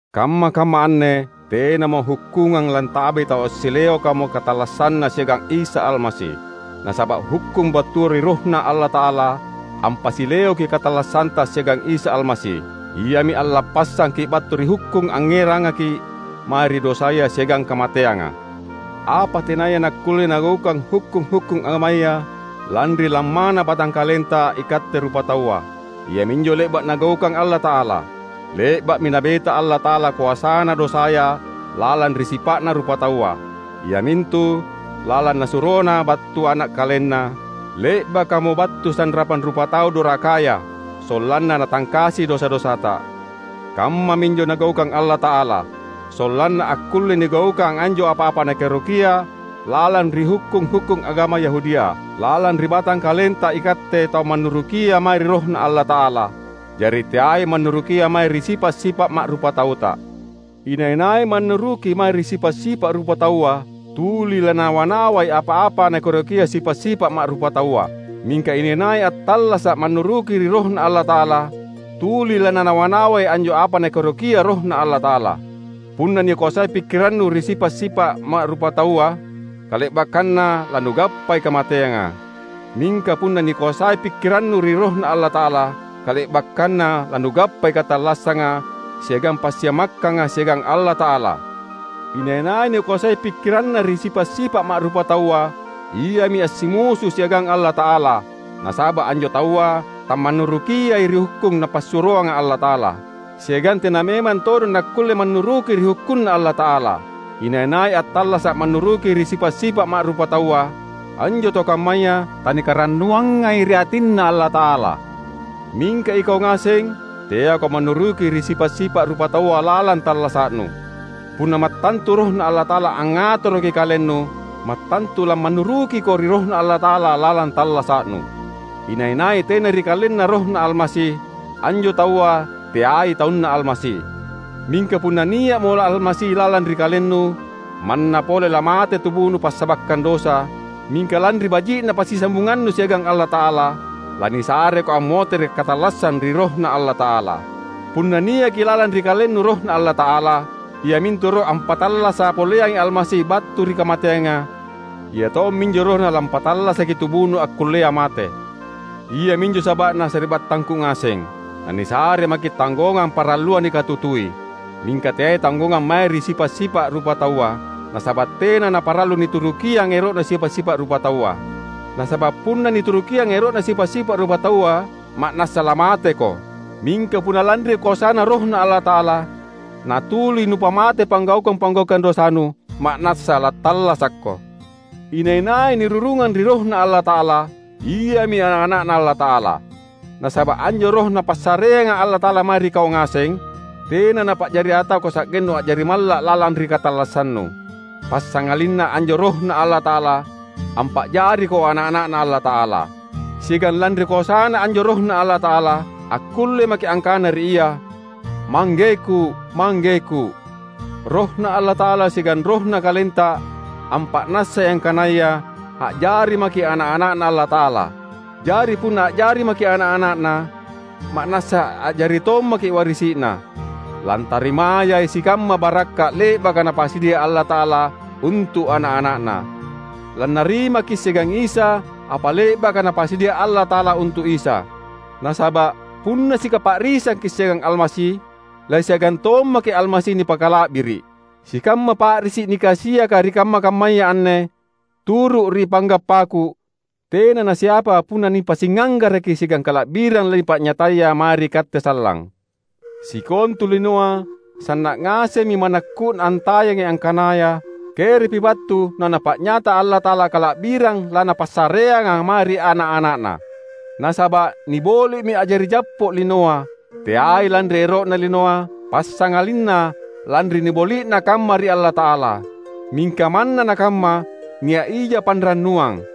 Kamma-kamma anne tenamo hukkungang lantabai tau assileokamo katallassanna siagang Isa Almasi. Nasaba’ hukkung battua ri RohNa Allata’ala ampasileoki katallassanta siagang Isa Almasi; Iami allappassangki’ battu ri hukkung angngerangaki’ mae ri dosaya siagang kamateanga. Apa tenaya nakkulle nagaukang hukkung-hukkung agamaya, lanri lammana batangkalenta ikatte rupataua, iaminjo le’ba’ Nagaukang Allata’ala. Le’ba’mi Nabeta Allata’ala koasana dosaya lalang ri sipa’na rupataua; iamintu lalang Nasurona battu Ana’ KalenNa, le’bakamo battu sanrapang rupatau dorakaya, sollanna Natangkasi dosa-dosata. Kammaminjo Nagaukang Allata’ala, sollanna akkulle nigaukang anjo apa-apa Nakaerokia lalang ri hukkung-hukkung agama Yahudia, lalang ri batangkalenta ikatte tau mannurukia mae ri RohNa Allata’ala, jari teai mannurukia mae ri sipa’-sipa’ ma’rupatauta. Inai-nai mannuruki mae ri sipa’-sipa’ rupataua, tuli lananawa-nawai apa-apa nakaerokia sipa’-sipa’ ma’rupataua. Mingka inai-nai attallasa’ mannuruki ri RohNa Allata’ala, tuli lananawa-nawai anjo apa Nakaerokia RohNa Allata’ala. Punna nikoasai pikkirannu ri sipa’-sipa’ ma’rupataua, kale’bakkanna lanugappai kamateanga. Mingka punna nikoasai pikkirannu ri RohNa Allata’ala, kale’bakkanna lanugappai katallassanga siagang passiamakkanga siagang Allata’ala. Inai-nai nikoasai pikkiranna ri sipa’-sipa’ ma’rupataua, iami assimusu siagang Allata’ala; nasaba’ anjo taua tamannurukiai ri hukkung Napassuroanga Allata’ala; siagang tena memang todong nakkulle mannuruki ri hukkunNa Allata’ala. Inai-nai attallasa’ mannuruki ri sipa’-sipa’ ma’rupataua, anjo tau kammaya tanikarannuangai ri atinNa Allata’ala. Mingka ikau ngaseng teako mannuruki ri sipa’-sipa’ rupataua lalang tallasa’nu. Punna mattantu RohNa Allata’ala angngatoroki kalennu, mattantu lamannurukiko ri RohNa Allata’ala lalang tallasa’nu. Inai-nai tena ri kalenna RohNa Almasi, anjo taua teai taunNa Almasi. Mingka punna nia’mo Almasi lalang ri kalennu, manna pole lamate tubunu passabakkang dosa, mingka lanri baji’na passisambungannu siagang Allata’ala, lanisareko ammotere’ katallassang ri RohNa Allata’ala. Punna niaki lalang ri kalennu RohNa Allata’ala, iamintu Roh ampattallasa’ poleangai Almasi battu ri kamateanga, Ia tomminjo RohNa lampattallasaki tubunu akkullea mate. Iaminjo saba’na, sari’battangku ngaseng, nanisare maki’ tanggongang parallua nikatutui; mingka teai tanggongang mae ri sipa’-sipa’ rupataua, nasaba’ tena naparallu niturukiang ero’na sipa’-sipa’ rupataua. Nasaba’ punna niturukiang ero’na sipa’-sipa’ rupataua ma’nassa lamateko; mingka punna lanri koasaNa RohNa Allata’ala natuli nupamate panggaukang-panggaukang dosanu, ma’nassa lattallasakko. Inai-nai nirurungang ri RohNa Allata’ala, iami ana’-ana’Na Allata’ala. Nasaba’ anjo Roh Napassareanga Allata’ala mae ri kau ngaseng, tena Napa’jari atako sa’gennu a’jari malla’ lalang ri katallassannu. Passangalinna anjo RohNa Allata’ala ampa’jariko ana’-ana’Na Allata’ala. Siagang lanri koasaNa anjo RohNa Allata’ala akkulle maki’ angkana ri Ia, "Manggeku, Manggeku!" RohNa Allata’ala siagang rohna kalenta ampa’nassai angkanaya a’jari maki’ ana’-ana’Na Allata’ala. Jari punna a’jari maki’ ana’-ana’Na, ma’nassa a’jari tommaki’ warisi’Na, lantarimayai sikamma barakka’ le’baka Napasadia Allata’ala untu’ ana’-ana’Na. Lannarimaki’ siagang Isa apa le’baka Napasadia Allata’ala untu’ Isa; nasaba’ punna sikapa’risangki’ siagang Almasi, lasiagang tommaki’ Almasi nipakala’biri’. Sikamma pa’risi’ nikasiaka ri kamma-kammaya anne turu’ ri panggappaku, tena nasiapa punna nipasingnganggaraki siagang kala’birang lanipa’nyataya mae ri katte sallang. Sikontu linoa sanna’ ngasemmi manakku’na antayangi angkanaya kerepi wattu naNapa’nyata Allata’ala kala’birang laNapassareanga mae ri ana’-ana’Na. Nasaba’ niboli’mi a’jari jappo’ linoa, teai lanri ero’na linoa, passangalinna lanri niboli’na kamma ri Allata’ala. Mingka manna nakamma nia’ija panrannuang: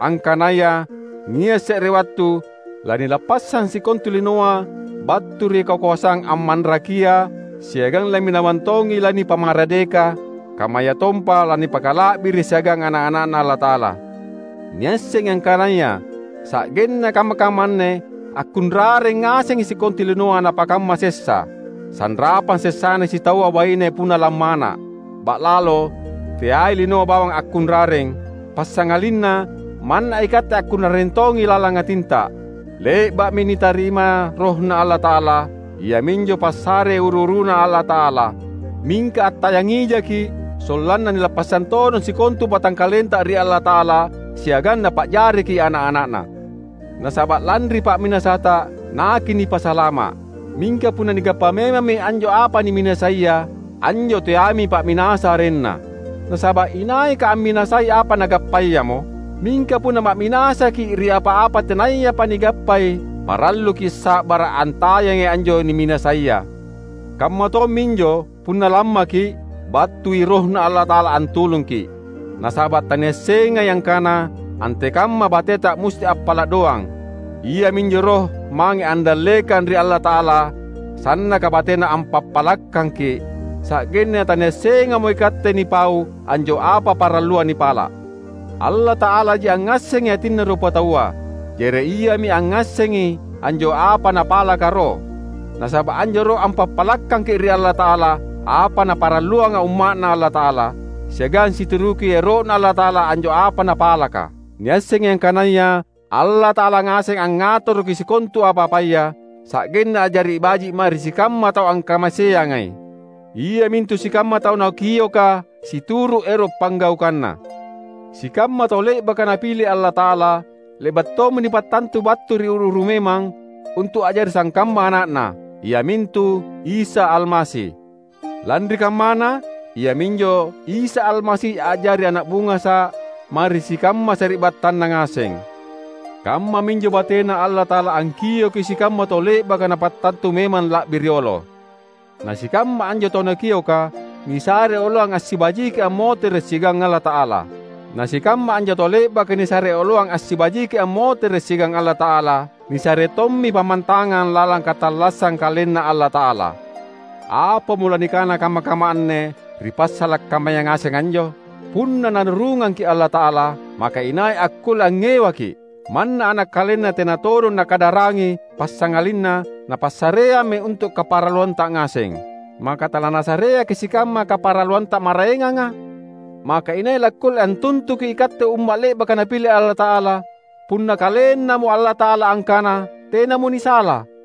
angkanaya nia’ se’re wattu nanilappassang sikontu linoa battu ri kakoasang ammanrakia siagang lamminawang tongi lanipamaradeka kammayatompa lanipakala’biri’ siagang ana’-ana’Na Allata’ala. Niassengi angkanaya sa’genna kamma-kamma anne akkunrareng ngasengi sikontu linoa napakamma sessa, sanrapang sessana sitaua baine punna lammana’. Ba’lalo teai linoa bawang akkunrareng; passangalinna manna ikatte akkunrareng tongi lalang atinta. Le’ba’mi nitarima RohNa Allata’ala. Iaminjo passare uru-uruNa Allata’ala. Mingka attayangijaki’, sollanna nilappassang todong sikontu batangkalenta ri Allata’ala siagang Napa’jariki’ ana’-ana’Na. Nasaba’ lanri pa’minasata, nakinipasalama’. Mingka punna nigappa memammi anjo apa niminasaia, anjo teaimi pa’minasa arenna. Nasaba’ inaika amminasai apa nagappayamo? Mingka punna ma’minasaki’ ri apa-apa tenayapa nigappai, paralluki sa’bara’ antayangi anjo niminasaia. Kamma tomminjo, punna lammaki’, battui RohNa Allata’ala antulungki’. Nasaba’ taniassengai angkana antekamma bateta musti appala’ doang; Iaminjo Roh mange andallekang ri Allata’ala sannaka batena ampappalakkangki’, sa’genna taniassengamo ikatte nipau anjo apa parallua nipala’. Allata’alaji angngassengi atinna rupataua; jari Iami angngassengi anjo apa Napalaka Roh. Nasaba’ anjo Roh ampappalakkangi ri Allata’ala apa naparalluanga umma’Na Allata’ala; siagang situruki ero’Na Allata’ala anjo apa napalaka. Niassengi angkanaya Allata’ala ngaseng angngatoroki sikontu apa-apaya, sa’genna a’jari baji’ mae ri sikamma tau angkamaseangai, iamintu sikamma tau Nakioka situru’ ero’ panggaukanNa. Sikamma tau le’baka Napile Allata’ala, le’ba’ tommi nipattantu battu ri uru-uru memang untu’ a’jari sangkamma ana’Na, iamintu Isa Almasi. Lanri kammana, iaminjo Isa Almasi a’jari ana’ bungasa’ mae ri sikamma sari’battanna ngaseng. Kammaminjo bateNa Allata’ala angkioki sikamma tau le’baka Napattantu memang la’bi riolo; na sikamma anjo tau Nakioka nisare oloang assibajiki ammotere’ siagang Allata’ala. Na sikamma anjo tau le’baka nisare oloang assibajiki ammotere’ siagang Allata’ala, nisare tommi pammantangang lalang katallassang KalenNa Allata’ala. Apamo lanikana kamma-kamma anne ri passala’ kammaya ngaseng anjo? Punna Narurungangki’ Allata’ala, maka inai akkulle angngewaki’? Manna ana’ KalenNa tena todong Nakadarangi, passangalinna Napassareammi untu’ kaparalluanta ngaseng; maka talaNasareaki’ sikamma kaparalluanta maraenganga? Maka inai lakkulle antuntukki’ ikatte umma’ le’baka Napile Allata’ala, punna KalenNamo Allata’ala angkana tenamo nisala?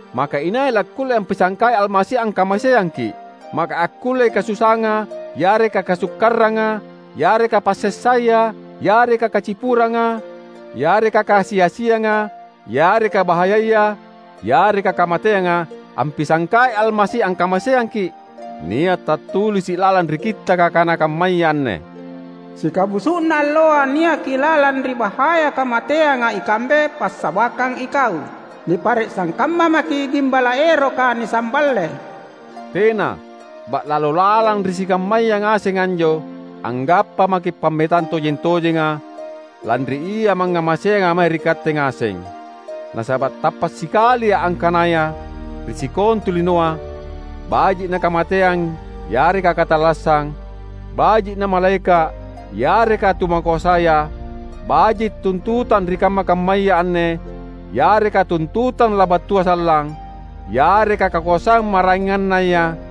Maka inai lakkulle ampisangkai Almasi angkamaseangki’? Maka akkullei kasusaanga yareka kasukkaranga, yareka passessaya, yareka kacipuranga, yareka kakasi-asianga, yareka bahayaya, yareka kamateanga, ampisangkai Almasi angkamaseangki’? Nia’ tattulisi’ lalang ri Kittaka kana kammaya anne: "Sikabusu’na alloa niaki lalang ri bahaya kamateanga ikambe passabakkang Ikau. Nipare’ sangkamma maki’ gimbala’ eroka nisamballe." Tena! Ba’lalo lalang ri sikammaya ngaseng anjo anggappa maki’ pammetang tojeng-tojenga lanri Ia mangngamaseanga mae ri katte ngaseng! Nasaba’ tappa’ sikalia’ angkanaya ri sikontu linoa, baji’ nakamateang yareka katallassang, baji’ namalaeka’ yareka tu makoasaya, baji’ tuntutang ri kamma-kammaya anne yareka tuntutang labattua sallang, yareka kakoasang maraengannaya;